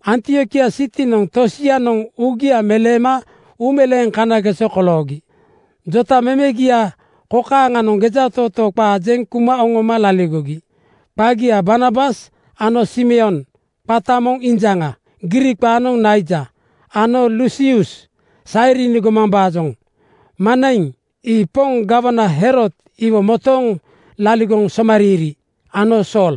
Antiokia sitinoŋ tosianoŋ uugia meleema uumeleeŋ kanageso koloogi jotamemegia kokaaŋanoŋ gejatootoo qaa jeŋ kuma oŋoma laligogi: Qagia Barnabas ano Simeon qata moŋ Injaŋa (Griik qaanoŋ Naija) ano Lusius (Sairini gomambaajoŋ), Manaiŋ (ii poŋ gawana Herod iwo motooŋ laligoŋ somariiri) ano Sool.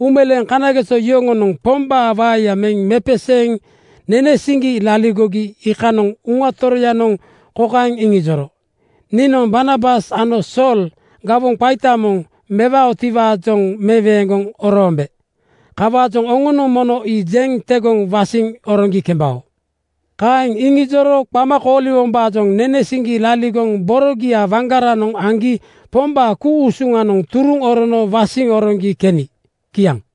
Uumeleeŋ kanageso yoŋonoŋ Pombaa waeya meŋ mepeseeŋ nene siŋgi laligogi iikanoŋ Uŋa Toroyanoŋ kokaeŋ iŋijoro, “Niinoŋ Barnabas ano Sool gawoŋ qaita moŋ mewaotiwaajoŋ meweeŋgoŋ oroombe. Kawaajoŋ oŋonoŋ mono ii jeŋ tegoŋ wasiŋ oroŋgi kembao.” Kaeŋ iŋijoro qama kooliwombaajoŋ nene siŋgi laligoŋ borogia waŋgaranoŋ aŋgi Pombaa ku-usuŋanoŋ turuŋ orono wasiŋ oroŋgi keni. Kiaŋ.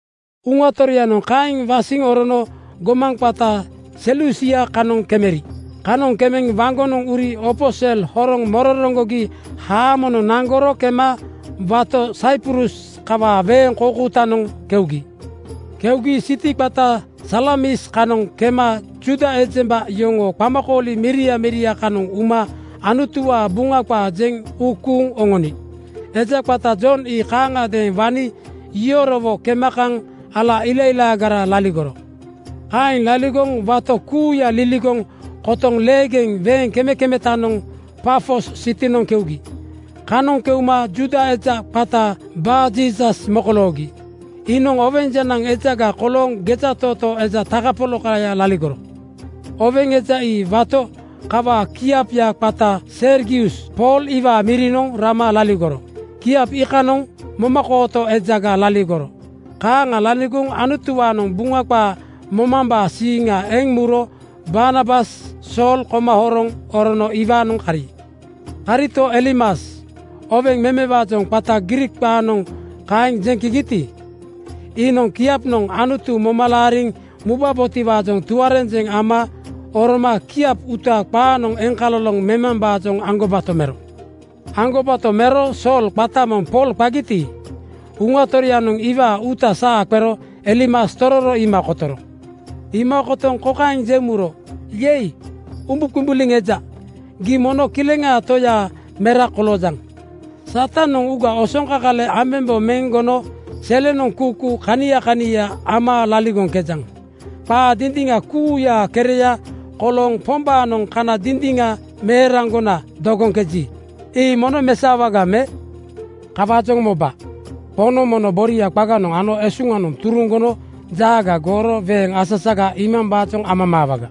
Uŋa Toroyanoŋ kaeŋ wasiŋ orono gomaŋ qata Selusia kanoŋ kemeri. Kanoŋ kemeŋ waŋgonoŋ uri opo sel horoŋ mororoŋgogi haamonoŋ naŋgoro kema wato Saiprus kawaa weeŋ koukoutanoŋ keugi. Keugi siti qata Salamis kanoŋ kema Juuda ejemba yoŋoo qamakooli miria miria kanoŋ uma Anutuwaa Buŋa qaa jeŋ uu kuuŋ oŋoni. Eja qata Jon ii kaaŋagadeeŋ wani yorowo kema kaŋ ala ilailaagaraga laligoro. Kaeŋ laligoŋ wato kuuya liligoŋ kotoŋ leegeŋ weeŋ kemekemetanoŋ Pafos sitinoŋ keugi. Kanoŋ keuma Juuda eja qata Barjiisas mokoloogi. Iinoŋ oweŋ jenaŋ ejaga kolooŋ gejatootoo eja takapolakaya laligoro. Oweŋ eja ii wato kawaa kiapya qata Sergius Pool iwaa mirinoŋ rama laligoro. Kiap iikanoŋ momakooto ejaga laligoro. Kaaŋa laligoŋ Anutuwaanoŋ Buŋa qaa momambaa siiŋa eŋ muro Barnabas Sool koma horoŋ orono iwaanoŋ kari. Karito, Elimas, (oweŋ memewaajoŋ qata Griik qaanoŋ kaeŋ jeŋkegiti,) iinoŋ kiapnoŋ Anutu moma laariŋ mubabotiwaajoŋ tuarenjeŋ ama oroma kiap uuta qaanoŋ eŋkaloloŋ memambaajoŋ aŋgobato mero. Aŋgobato mero Sool, qata moŋ Pool qagiti, Uŋa Toroyanoŋ iwaa uuta saa qero Elimas tororo iima kotoro. Iima kotoŋ kokaeŋ jeŋ muro, “Yei! Umbuqumbuliŋ eja, gii mono Kileŋaa Toyaa mera koloojaŋ. Satanoŋ uuga osoŋkakale ambembo meŋ gono selenoŋ kuukuu kania kania ama laligoŋkejaŋ. Qaa dindiŋa kuuyaa kereya kolooŋ Pombaanoŋ kana dindiŋa meeraŋgona dogoŋkeji, ii mono mesaowaga me? Kawaajoŋ moba! Poŋnoŋ mono boria qaganoŋ ano esuŋanoŋ turuŋ gono jaaga gooro weeŋ asasaga iimambaajoŋ amamaawaga.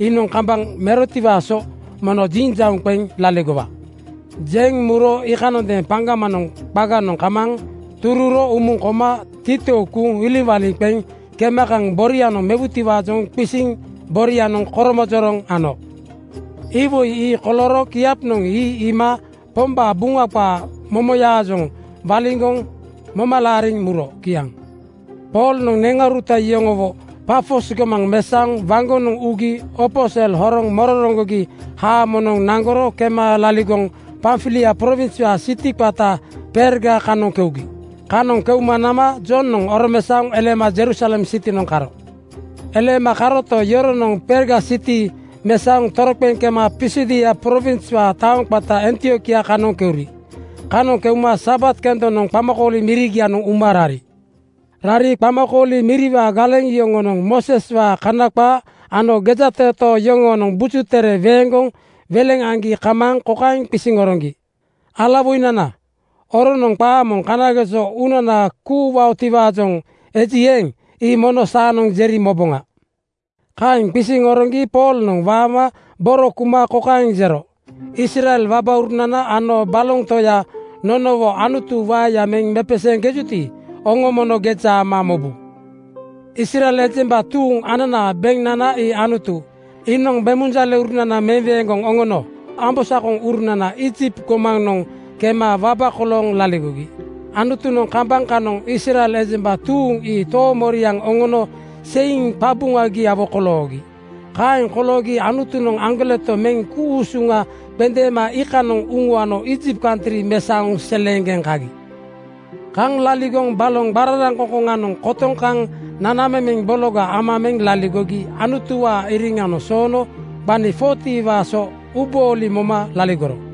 Iinoŋ kambaŋ merotiwaa so mono jinjauŋ qeŋ laligowa.” Jeŋ muro iikanondeeŋ paŋgamanoŋ qaganoŋ kamaaŋ tururo umuŋ koma titou kuuŋ iliŋwaliŋ qeŋ kema kaŋ borianoŋ mewutiwaajoŋ qisiŋ borianoŋ koromojoroŋ ano. Iwoi ii kolooro kiapnoŋ ii iima Pombaa Buŋa qaa momoyaajoŋ waliŋgoŋ moma laariŋ muro. Kiaŋ. Poolnoŋ neŋauruta yoŋowo Pafos gomaŋ mesaoŋ waŋgonoŋ ugi opo sel horoŋ mororoŋgogi haamonoŋ naŋgoro kema laligoŋ Pamfilia prowinswaa siti qata Perga kanoŋ keugi. Kanoŋ keuma nama Jonoŋ oromesaoŋ eleema Jerusalem sitinoŋ karo. Eleema karoto, yoronoŋ Perga siti mesaoŋ toroqeŋ kema Pisidia prowinswaa taoŋ qata Antiokia kanoŋ keuri. Kanoŋ keuma Sabat kendonoŋ qamakooli mirigianoŋ uma rari. Rari qamakooli miriwaa galeŋ yoŋonoŋ Mooseswaa Kana qaa ano gejatootoo yoŋoonoŋ Buju Tere weeŋgoŋ weleŋ aŋgi kamaaŋ kokaeŋ qisiŋ oroŋgi, “Alawoinana, oroonoŋ qaa moŋ kanageso uunana kuuwaotiwaajoŋ eji eeŋ, ii mono saanoŋ jeri moboŋa.” Kaeŋ qisiŋ oroŋgi Poolnoŋ waama boro kuma kokaeŋ jero, “Israel wabaurunana ano baloŋ toya nonowo Anutu waeya meŋ mepeseeŋkejuti, oŋo mono geja ama mobu. Israel ejemba tuuŋ ananaa beŋnana ii Anutu. Iinoŋ bemunjaleurunana meweeŋgoŋ oŋono ambosakoŋurunananoŋ Iijipt gomanoŋ kema waba kolooŋ laligogi. Anutunoŋ kambaŋ kanoŋ Israel ejemba tuuŋ ii toomoriaŋ oŋono seiŋ qabuŋagiawo koloogi. Kaeŋ koloogi Anutunoŋ aŋgoleto meŋ ku-usuŋa qendeema iikanoŋ uŋuano Iijipt kantri mesaoŋ seleeŋgeŋ kagi. “Kaŋ laligoŋ baloŋ qararaŋkoŋkoŋanoŋ kotoŋ kaŋ nanamemeŋ bologa ama meŋ laligogi Anutuwaa iriŋa soono gbani 40:waa so uubooli moma laligoro.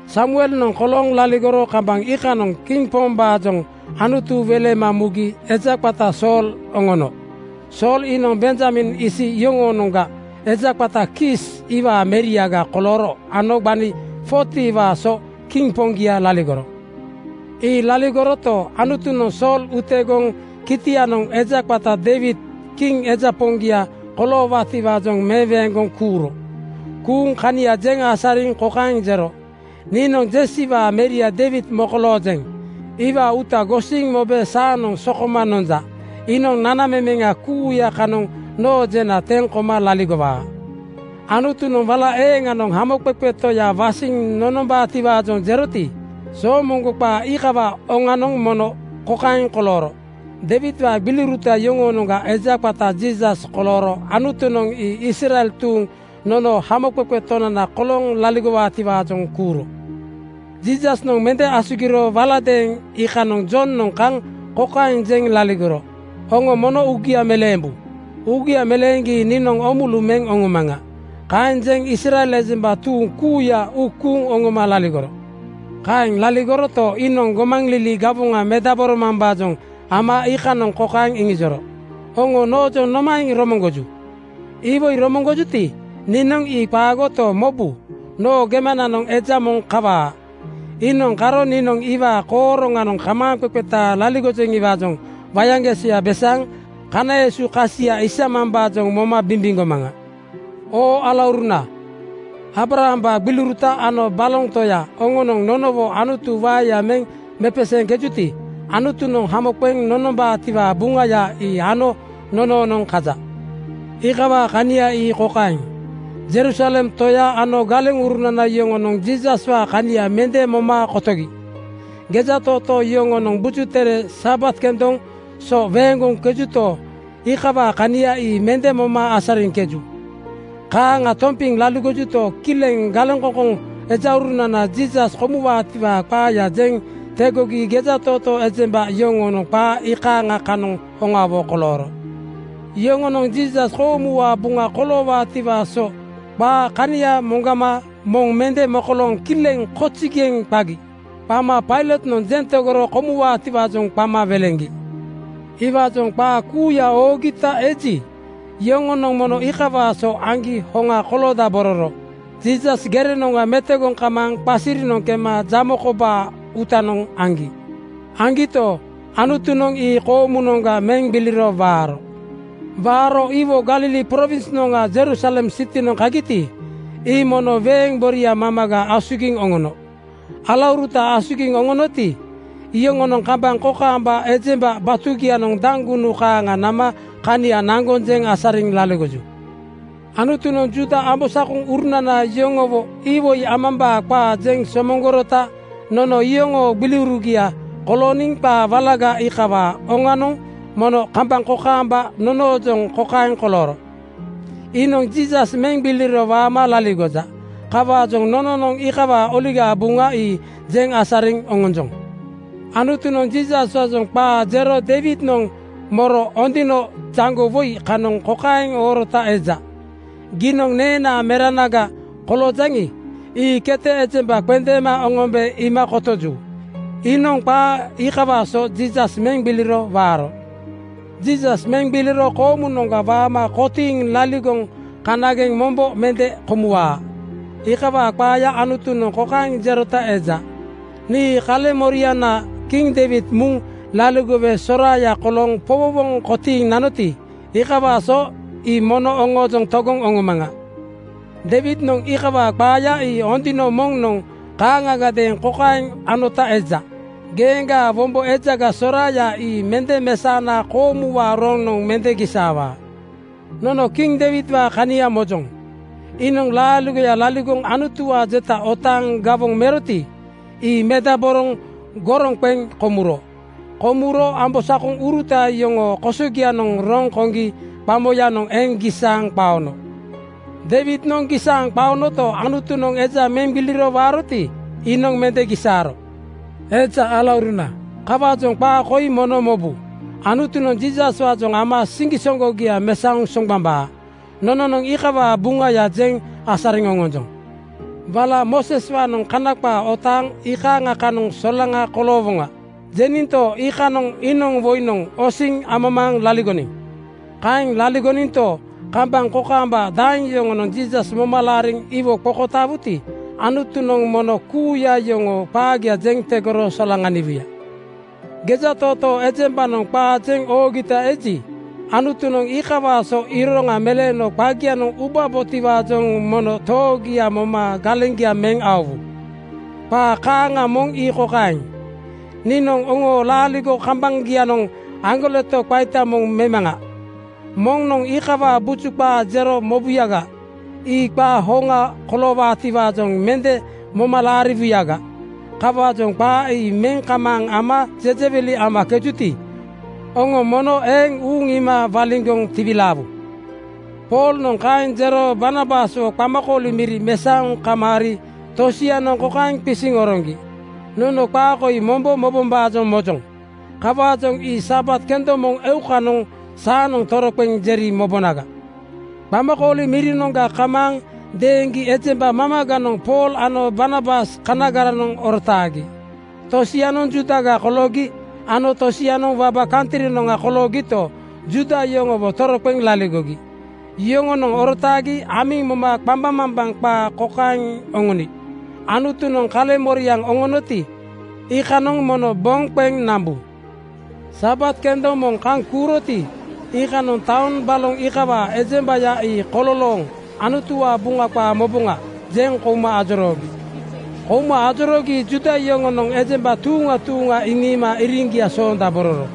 “Samuelnoŋ kolooŋ laligoro kambaŋ iikanoŋ kiŋ pombaajoŋ Anutu welema mugi eja qata Sool oŋono. Sool iinoŋ Benjamin isi yoŋoonoŋga eja qata Kiis iwaa meriaga kolooro ano gbani 40:waa so kiŋ poŋgia laligoro. Ii laligoroto, Anutunoŋ Sool utegoŋ kitianoŋ eja qata Deiwid kiŋ eja poŋgia koloowaatiwaajoŋ meweeŋgoŋ kuuro. Kuuŋ kania jeŋ asariŋ kokaeŋ jero, ‘Niinoŋ Jesiwaa meria Deiwid mokoloojeŋ. Iwaa uuta gosiŋ mobe saanoŋ sokoma nonja. Iinoŋ nanamemeŋa kuuya kanoŋ noo jena teŋ koma laligowaa.’ Anutunoŋ wala eeŋanoŋ Hamoqeqe Toya wasiŋ nonombaatiwaajoŋ jeroti, soomoŋgo qaa iikawaa oŋanoŋ mono kokaeŋ kolooro: Deiwidwaa gbiliuruta yoŋoonoŋga eja qata Jiisas kolooro Anutunoŋ ii Israel tuuŋ nonoo Hamoqeqe Tonana kolooŋ laligowaatiwaajoŋ kuuro. “Jiisasnoŋ mende asugiro waladeeŋ iikanoŋ Jonoŋ kaŋ kokaeŋ jeŋ laligoro, ‘Oŋo mono uugia meleembu. Uugia meleeŋgi niinoŋ oomulu meŋ oŋomaŋa.’ Kaeŋ jeŋ Israel ejemba tuuŋ kuuya uu kuuŋ oŋoma laligoro. Kaeŋ laligoroto, iinoŋ gomaŋlili gawoŋa mendaboromambaajoŋ ama iikanoŋ kokaeŋ iŋijoro, ‘Oŋo noojoŋ nomaeŋ romoŋgoju? Iwoi romoŋgojuti, niinoŋ ii qaagoto, mobu, noo gemananoŋ eja moŋ kawaa. Iinoŋ karo niinoŋ iwaa kooroŋanoŋ kamaaŋqeqeta laligojeŋiwaajoŋ wayaŋgesoya besaaŋ kana esu kasia isamambaajoŋ moma bimbiŋgomaŋa.’ “Oo alauruna, Aabrahambaa gbiliuruta ano baloŋ toya oŋonoŋ nonowo Anutu waeya meŋ mepeseeŋkejuti, Anutunoŋ hamo qeŋ nonombaatiwaa Buŋaya ii ano nonoonoŋ kaja. Iikawaa kania ii kokaeŋ: Jerusalem toya ano galeŋurunana yoŋonoŋ Jiisaswaa kania mende moma kotogi. Gejatootoo yoŋoonoŋ Buju Tere Sabat kendoŋ so weeŋgoŋkejuto, iikawaa kania ii mende moma asariŋkeju. Kaaŋa tompiŋ laligojuto, kileŋ galeŋkoŋkoŋ ejaurunananoŋ Jiisas komuwaatiwaa qaaya jeŋ tegogi gejatootoo ejemba yoŋoonoŋ qaa ii iikaaŋa kanoŋ hoŋawo kolooro. Yoŋonoŋ Jiisas koomuwaa buŋa koloowaatiwaa so qaa kania moŋgama moŋ mende mokolooŋ kileŋ “Kozigeŋ!” qagi. Qama Pailotnoŋ jeŋ tegoro komuwaatiwaajoŋ qama weleŋgi. “Iwaajoŋ qaa kuuya oogita eji, yoŋonoŋ mono iikawaa so aŋgi hoŋa koloodabororo Jiisas gerenoŋga metogoŋ kamaaŋ qasirinoŋ kema jamo kobaa uutanoŋ aŋgi. Aŋgito, Anutunoŋ ii koomu-noŋga meŋ gbiliro waaro. Waaro iwo Galili prowinsnoŋga Jerusalem sitinoŋ kagiti, ii mono weeŋ boria mamaga asugiŋ oŋono. Alauruta asugiŋ oŋonoti, iyoŋonoŋ kambaŋ kokaamba ejemba batugianoŋ daŋgunu kaaŋa nama kania naŋgoŋ jeŋ asariŋ laligoju. Anutunoŋ Juuda ambosakoŋurunana yoŋowo iwoi amambaa qaa jeŋ somoŋgorota nono iyoŋoo gbiliurugia kolooniŋ qaa walaga iikawaa oŋanoŋ mono kambaŋ kokaamba nonoojoŋ kokaeŋ kolooro: Iinoŋ Jiisas meŋ gbiliro waama laligoja. Kawaajoŋ nononoŋ iikawaa Oligaa Buŋa ii jeŋ asariŋ oŋonjoŋ. “Anutunoŋ Jiisaswaajoŋ qaa jero Deiwidnoŋ moro Ondino (Buk song) jaŋgo woi kanoŋ kokaeŋ oorota eja, ‘Giinoŋ neenaa meranaga koloojaŋi, ii kete ejemba qendeema oŋombe iima kotoju.’ Iinoŋ qaa iikawaa so Jiisas meŋ gbiliro waaro. Jiisas meŋ gbiliro koomunoŋga waama kotiiŋ laligoŋ kanageŋ mombo mende komuwaa. Iikawaa qaaya Anutunoŋ kokaeŋ jerota eja, ‘Nii kaleŋmoriana kiŋ Deiwid muŋ laligowe soraaya kolooŋ powowoŋ kotiiŋ nanoti, iikawaa so ii mono oŋoojoŋ togoŋ oŋomaŋa.’ Deiwidnoŋ iikawaa qaaya ii Ondino (Buk song) moŋnoŋ kaaŋagadeeŋ kokaeŋ anota eja, ‘Geeŋgaa wombo ejaga soraaya ii mende mesaona koomuwaa roŋnoŋ mende gisaawaa.’ Nono kiŋ Deiwidwaa kania mojoŋ: Iinoŋ laaligoya laligoŋ Anutuwaa jeta otaaŋ gawoŋ muroti, ii medaboroŋ goroŋ qeŋ komuro. Komuro ambosakoŋuruta yoŋoo kosogianoŋ roŋ koŋgi qamoyanoŋ eŋ gisaaŋ qaono. Deiwidnoŋ gisaaŋ qaonoto, Anutunoŋ eja meŋ gbiliro waaroti, iinoŋ mende gisaaro. “Eja alauruna, kawaajoŋ qaa koi mono mobu: Anutunoŋ Jiisaswaajoŋ ama siŋgisoŋgogia mesaoŋ soŋgbambaa. Nononoŋ iikawaa Buŋaya jeŋ asariŋ oŋonjoŋ. Wala ‘Mooseswaanoŋ Kana qaa otaaŋ iikaaŋa kanoŋ solaŋa koloowoŋa,’ jeninto, iikanoŋ iinoŋ woinoŋ osiŋ amamaaŋ laligoniŋ. Kaeŋ laligoninto, kambaŋ kokaamba daeŋ yoŋonoŋ Jiisas moma laariŋ iwo qokotaawuti, Anutunoŋ mono kuuya yoŋoo qaagia jeŋ tegoro solaŋaniwuya. Gejatootoo ejembanoŋ qaa jeŋ oogita eji, Anutunoŋ iikawaa so iroŋa meleeno qagianoŋ ubabotiwaajoŋ mono toogia moma galeŋgia meŋ aowu. Qaa kaaŋa moŋ ii kokaeŋ, ‘Niinoŋ oŋoo laaligo kambaŋanoŋ aŋgoleto qaita moŋ memaŋa. Moŋnoŋ iikawaa buju qaa jero mobuyaga, ii qaa hoŋa koloowaatiwaajoŋ mende moma laariwuyaga. Kawaajoŋ qaa ii meŋ kamaaŋ ama jejewili amakejuti, oŋo mono eeŋ uuŋ iima waliŋgoŋ tiwilaawu.’” Poolnoŋ kaeŋ jero Barnabaswo qamakooli miri mesaoŋ kamaari tosianoŋ kokaeŋ qisiŋ oroŋgi, “Nono qaa koi mombo mobombaajoŋ mojoŋ. Kawaajoŋ ii Sabat kendoŋ moŋ eukanoŋ saanoŋ toroqeŋ jeri mobonaga.” Qamakooli mirinoŋga kamaaŋ deeŋgi ejemba mamaganoŋ Pool ano Barnabas kanagaranoŋ orotaagi. Tosianoŋ Juudaga koloogi ano tosianoŋ waba kantrinoŋa koloogito, Juuda yoŋowo toroqeŋ laligogi. Yoŋonoŋ orotaagi amiŋ moma qambaŋmambaŋ qaa kokaeŋ oŋoni, “Anutunoŋ kaleŋmoriaŋ oŋonoti, iikanoŋ mono boŋ qeŋ nambu.” Sabat kendoŋ moŋ kaŋ kuuroti, iikanoŋ taoŋ baloŋ iikawaa ejembaya ii kololooŋ “Anutuwaa Buŋa qaa moboŋa,” jeŋ kouma ajoroogi. Kouma ajoroogi Juuda yoŋonoŋ ejemba tuuŋa tuuŋa iŋiima iriŋgia soondabororo.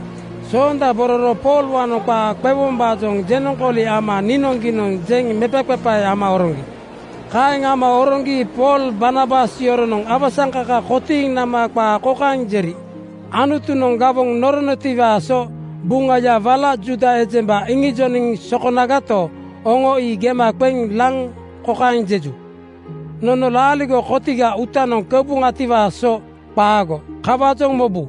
Soondabororo Poolwaanoŋ qaa qewombaajoŋ jenoŋkooli ama niinoŋgiinoŋ jeŋ mepaqepae ama oroŋgi. Kaeŋ ama oroŋgi Pool Barnabas yoronoŋ awasaŋkaka kotiiŋ nama qaa kokaeŋ jeri, “Anutunoŋ gawoŋ noronotiwaa so Buŋaya wala Juuda ejemba iŋijoniŋ sokonagato, oŋo ii gema qeŋ laŋ kokaeŋ jeju, ‘Nono laaligo kotiga uutanoŋ keuboŋatiwaa so qaago.’ Kawaajoŋ mobu,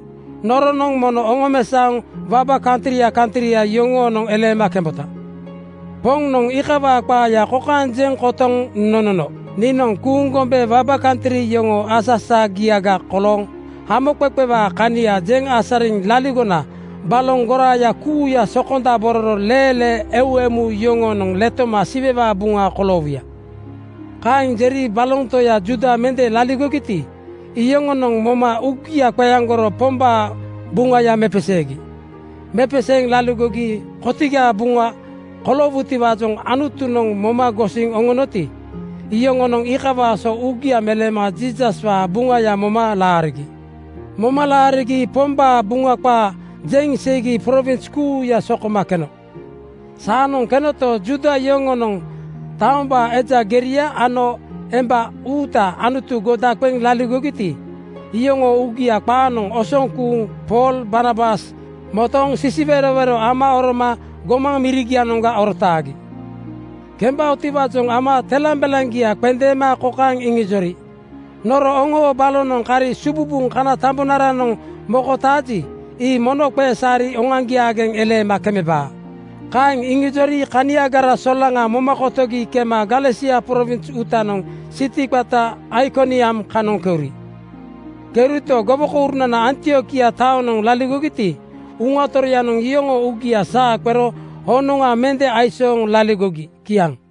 noronoŋ mono oŋomesaoŋ waba kantria kantria yoŋoonoŋ eleema kembota. Poŋnoŋ iikawaa qaaya kokaeŋ jeŋ kotoŋ nonono, ‘Niinoŋ kuuŋ gombe waba kantri yoŋoo asasagiaga kolooŋ hamoqeqewaa kania jeŋ asariŋ laligona baloŋ goraaya kuuya sokondabororo leelee eu emu yoŋonoŋ letoma Siwewaa buŋa koloowuya.’” Kaeŋ jeri baloŋ toya Juuda mende laligogiti, iyoŋonoŋ moma uugia qeaŋgoro Pombaa Buŋaya mepeseegi. Mepeseeŋ laaligo kotigaa buŋa koloowutiwaajoŋ Anutunoŋ moma gosiŋ oŋonoti, iyoŋonoŋ iikawaa so uugia meleema Jiisaswaa Buŋaya moma laarigi. Moma laarigi Pombaa Buŋa qaa jeŋ seigi prowins kuuya sokoma keno. Saanoŋ kenoto, Juuda yoŋonoŋ taombaa eja geria ano emba uuta Anutu goda qeŋ laligogiti, iyoŋoo uugia qaanoŋ osoŋ kuuŋ Pool Barnabas motooŋ sisiwerowero ama oroma gomaŋ mirigianoŋga orotaagi. Kembaotiwaajoŋ ama telambelaŋgia qendeema kokaeŋ iŋijori, “Noro oŋoo balonoŋ kari sububuŋ kana tambonaranoŋ mokotaaji, ii mono qesaari oŋoaŋgiaageŋ eleema kemebaa.” Kaeŋ iŋijori kaniagara solaŋa moma kotogi kema Galesia prowins uutanoŋ siti qata Aikoniam kanoŋ keuri. Keurito, gowokourunana Antiokia taonoŋ laligogiti, Uŋa Toroyanoŋ iyoŋoo uugia saa qero honoŋa mende aisooŋ laligogi. Kiaŋ.